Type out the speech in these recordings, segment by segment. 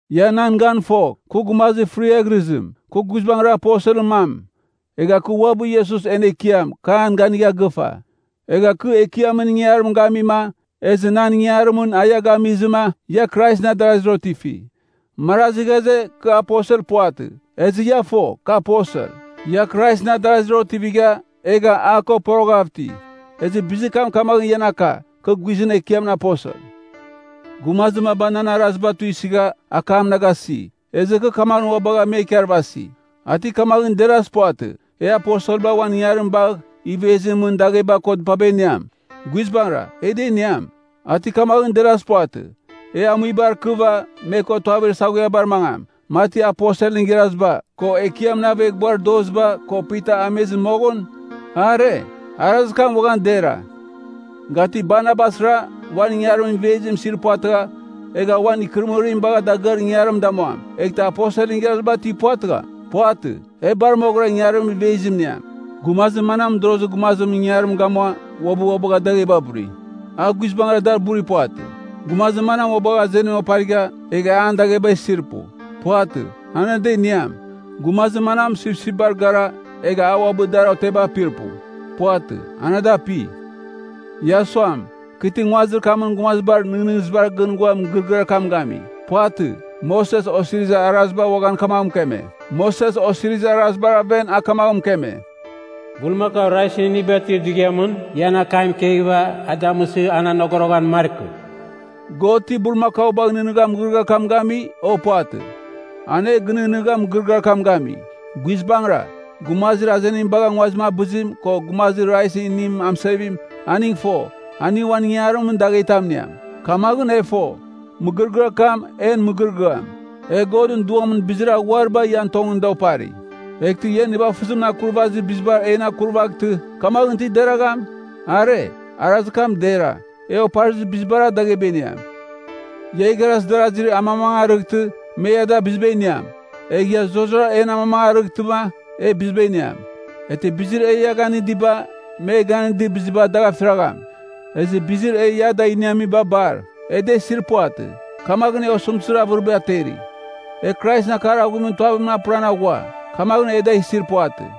Ia nan gan fogh, kɨ gumazir fɨrighɨrɨzim! Kɨ guizbangɨra aposelɨn mam! Egha kɨ uabɨ Iesus en Ekiam, kɨ an ganigha gɨfa. Egha kɨ Ekiamɨn ingangarim gamima, ezɨ nan ingangarimɨn a ia gamizɨma, ia Kraisɨn adarazir otifi! Marazi ghaze, kɨ aposel puvatɨ. Ezɨ ia fo, kɨ aposel. Ia Kraisɨn adarazir otivigha, egha a ko poroghav iti, ezɨ bizir kam kamaghɨn ian aka, kɨ guizɨn Ekiamɨn aposel. Gumazir maba nan araziba tuisɨgha, akam na gasi. Ezɨ kɨ kamaghɨn ua bagha me ikarvasi. A ti kamaghɨn derazir puvatɨ, e aposelba uan ingangarim bagh, ivezimɨn mɨn dagheba ko dɨpaba iniam? Guizbangɨra, e da iniam. A ti kamaghɨn derazir puvatɨ, e amuibar ikɨva, me ko tuavir saghuiabar mangam, mati aposelɨn igharaziba, ko Ekiamɨn aveghbuar doziba, ko Pita amizɨ moghɨn? Are, arazir kam uaghan dera. Ga ti Barnabasra, uan ingangarimɨn ivezim isir puvatɨgha, egh uan ikɨrɨmɨrim bagh dagɨar ingangarim damuam, eghtɨ aposelɨn igharaziba ti puvatɨgham? Puvatɨ, e bar moghɨra ingangarimɨn ivezim iniam. Gumazir manam mɨdorozir gumazimɨn ingangarim gamua, uabɨ ua bagha dagheba buri? A guizbangɨra, da burir puvatɨ. Gumazir manam ua bagha azenim oparigha, egha an dagheba isir pu? Puvatɨ, an ada iniam. Gumazir manam sipsipbar gara, egha a uabɨ dar oteba apir pu? Puvatɨ, an ada api. Ia suam, kɨ ti nguazir kamɨn gumazibar nɨghnɨzibar gɨn ghua mɨgɨrɨgɨar kam gami. Puvatɨ. Moses Osirizir Araziba uaghan kamaghɨn mɨkeme. Moses Osirizir Arazibar aven a kamaghɨn mɨkeme, “Bulmakau raizɨn iniba tuir dughiamɨn, ia an akam ikeghɨva, a damɨsɨ an anogoroghan markɨ.” God ti bulmakaubagh nɨghnɨgha mɨgɨrɨgɨar kam gami, o? Puvatɨ. An e ginɨghnɨgha mɨgɨrɨgɨar kam gami. Guizbangɨra, gumazir azenim bagha nguazim abɨzim, ko gumazir raizɨn inim amɨsevim, aning fo, aning uan ingangarimɨn daghetam iniam. Kamaghɨn e fo, mɨgɨrɨgɨar kam, en mɨgɨrɨgɨam. E Godɨn Duamɨn bizir aghuariba ian tongɨn da opari. Eghtɨ ia nivafɨzimɨn akurvazir bizibar en akurvaghtɨ, kamaghɨn ti deragham? Are, arazir kam dera, e oparizir bizibar dagheba iniam. Ia igharaz darazi amamangarɨghtɨ, me ia da biziba iniam, egh ia zurara en amamangarɨghtɨma, e biziba iniam. Eghtɨ bizir ia e ganɨdiba, me ganɨdir biziba, dagh afiragham. Ezɨ bizir e ia da iniamiba bar, e da isir puvatɨ. Kamaghɨn e osɨmtɨzir avɨriba ateri. E Kraisɨn akar aghuimɨn tuavim apɨran aghua, kamaghɨn e da isir puvatɨ.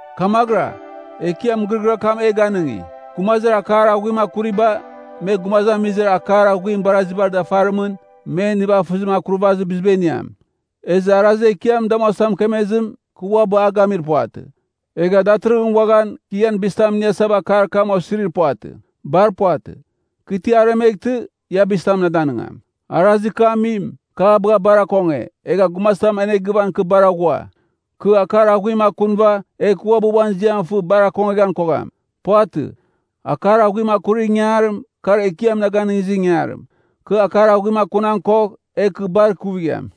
Kamaghɨra, Ekiam mɨgɨrɨgɨar kam e ganɨngi, gumazir akar aghuim akuriba, me gumazamizir akar aghuim barazibar dafarimɨn, men nivafɨzimɨn akurvazir biziba iniam. Ezɨ arazir Ekiam damuasa mɨkemezim, kɨ uabɨ a gamir puvatɨ. Egha datɨrɨghɨn uaghan, kɨ ian bizitam iniasava akar kam osirir puvatɨ. Bar puvatɨ. Kɨ ti aremeghtɨ, ia bizitam na danɨngam. Arazir kɨ amim, kɨ a bagha bar akonge, egha gumazitam anegɨvan kɨ bar aghua. Kɨ akar aghuim akunɨva, egh kɨ uabɨ uan ziam fɨ bar akongeghan kogham. Puvatɨ. Akar aghuim akurir ingangarim, kar Ekiam na ganɨngizir ingangarim. Kɨ akar aghuim akunan kogh, egh kɨ bar ikuvigham.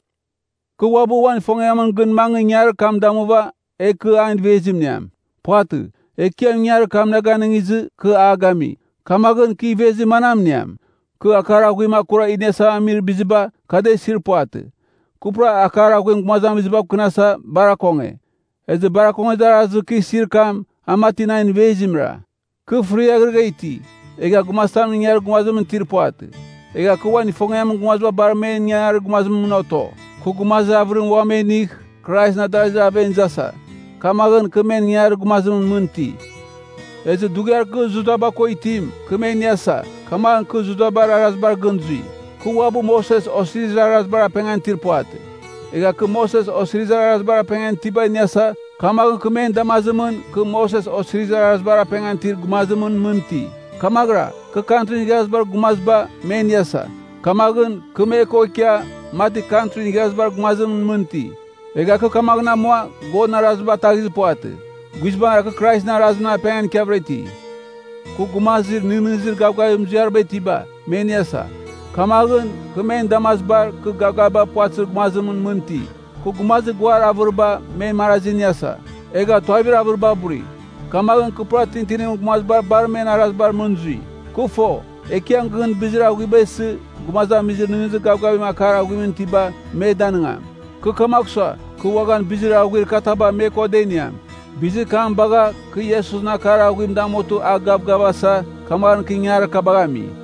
Kɨ uabɨ uan ifongiamɨn gɨn mangɨ ingangarir kam damuva, egh kɨ an ivezim iniam. Puvatɨ. Ekiam ingangarir kam na ganɨngizɨ, kɨ a gami. Kamaghɨn, kɨ ivezir manam iniam? Kɨ akar aghuim akura iniasava amir biziba, kɨ da isir puvatɨ. Kɨ pura akar aghuim gumazamizibav kɨnasa, bar akonge. Ezɨ bar akongezir arazir kɨ isir kam, a mati nan ivezimra. Kɨ fɨriaghrɨgha iti, egha gumazitamɨn ingangarir gumazimɨn itir puvatɨ. Egha kɨ uan ifongiamɨn gumaziba bar men ingangarir gumazimɨn mɨn oto. Kɨ gumazir avɨrim uam me inigh, Kraisɨn adarazir aven izasa. Kamaghɨn, kɨ men ingangarir gumazim mɨn iti. Ezɨ dughiar kɨ Judaba ko itim, kɨ me iniasa, kamaghɨn kɨ Judabar arazibar gɨn zui. Kɨ uabɨ Moses Osirizir Arazibar apengan itir puvatɨ. Egha kɨ Moses Osirizir Arazibar apengan itiba iniasa, kamaghɨn kɨ men damazimɨn, kɨ Moses Osirizir Arazibar apengan itir gumazimɨn mɨn iti. Kamaghɨra, kɨ Kantrin Igharazibar Gumaziba, me iniasa. Kamaghɨn, kɨ me ko ikia, mati Kantrin Igharazibar Gumazimɨn mɨn iti. Egha kɨ kamaghɨn amua, Godɨn arazim ataghizir puvatɨ. Guizbangɨra, kɨ Kraisɨn arazimɨn apengan ikiavɨra iti. Kɨ gumazir nɨghnɨzir gavgavir muziariba itiba, me iniasa. Kamaghɨn, kɨ men damazibar, kɨ gavgaviba puvatɨzir gumazimɨn mɨn iti. Kɨ gumazir guar avɨriba, men marazi iniasa, egha tuavir avɨriba buri. Kamaghɨn kɨ pura tintinimɨn gumaziba bar men arazibar mɨn zui. Kɨ fo, Ekiam gɨn bizir aghuiba isɨ, gumazamizir nɨghnɨzir gavgavim akar aghuimɨn itiba, me danɨngam. Kɨ kamagh sua, kɨ uaghan bizir aghuir kataba me ko da iniam. Bizir kam bagha, kɨ Iesusɨn akar aghuim damutɨ a gavgavasa, kamaghɨn kɨ ingangarir kabagh ami.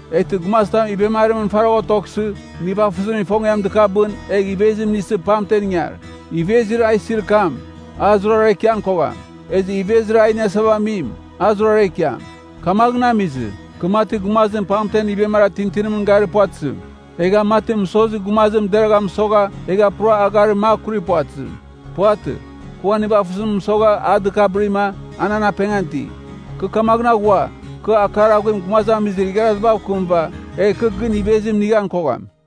Eghtɨ gumazitam ivemarimɨn faragh otoghsɨ, nivafɨzimɨn ifongiam dɨkabɨn, egh ivezim inisɨ pamten ingar. Ivezir a isir kam, a zurara ikian kogham. Ezɨ ivezir e iniasa amim, a zurara ikiam. Kamaghɨn amizɨ, kɨ mati gumazim pamtem ivemara tintinimɨn garir puvatɨzim. Egha mati mɨsozir gumazim deragha mɨsogha, egha pura agharim makurir puvatɨzim. Puvatɨ. Kɨ uan nivafɨzim mɨsogha a dɨkabɨrima, a nan apengan iti. Kɨ kamaghɨn aghua, kɨ akar aghuim gumazamizir igharazibav kɨmɨva, egh kɨ gɨn ivezim inighan kogham.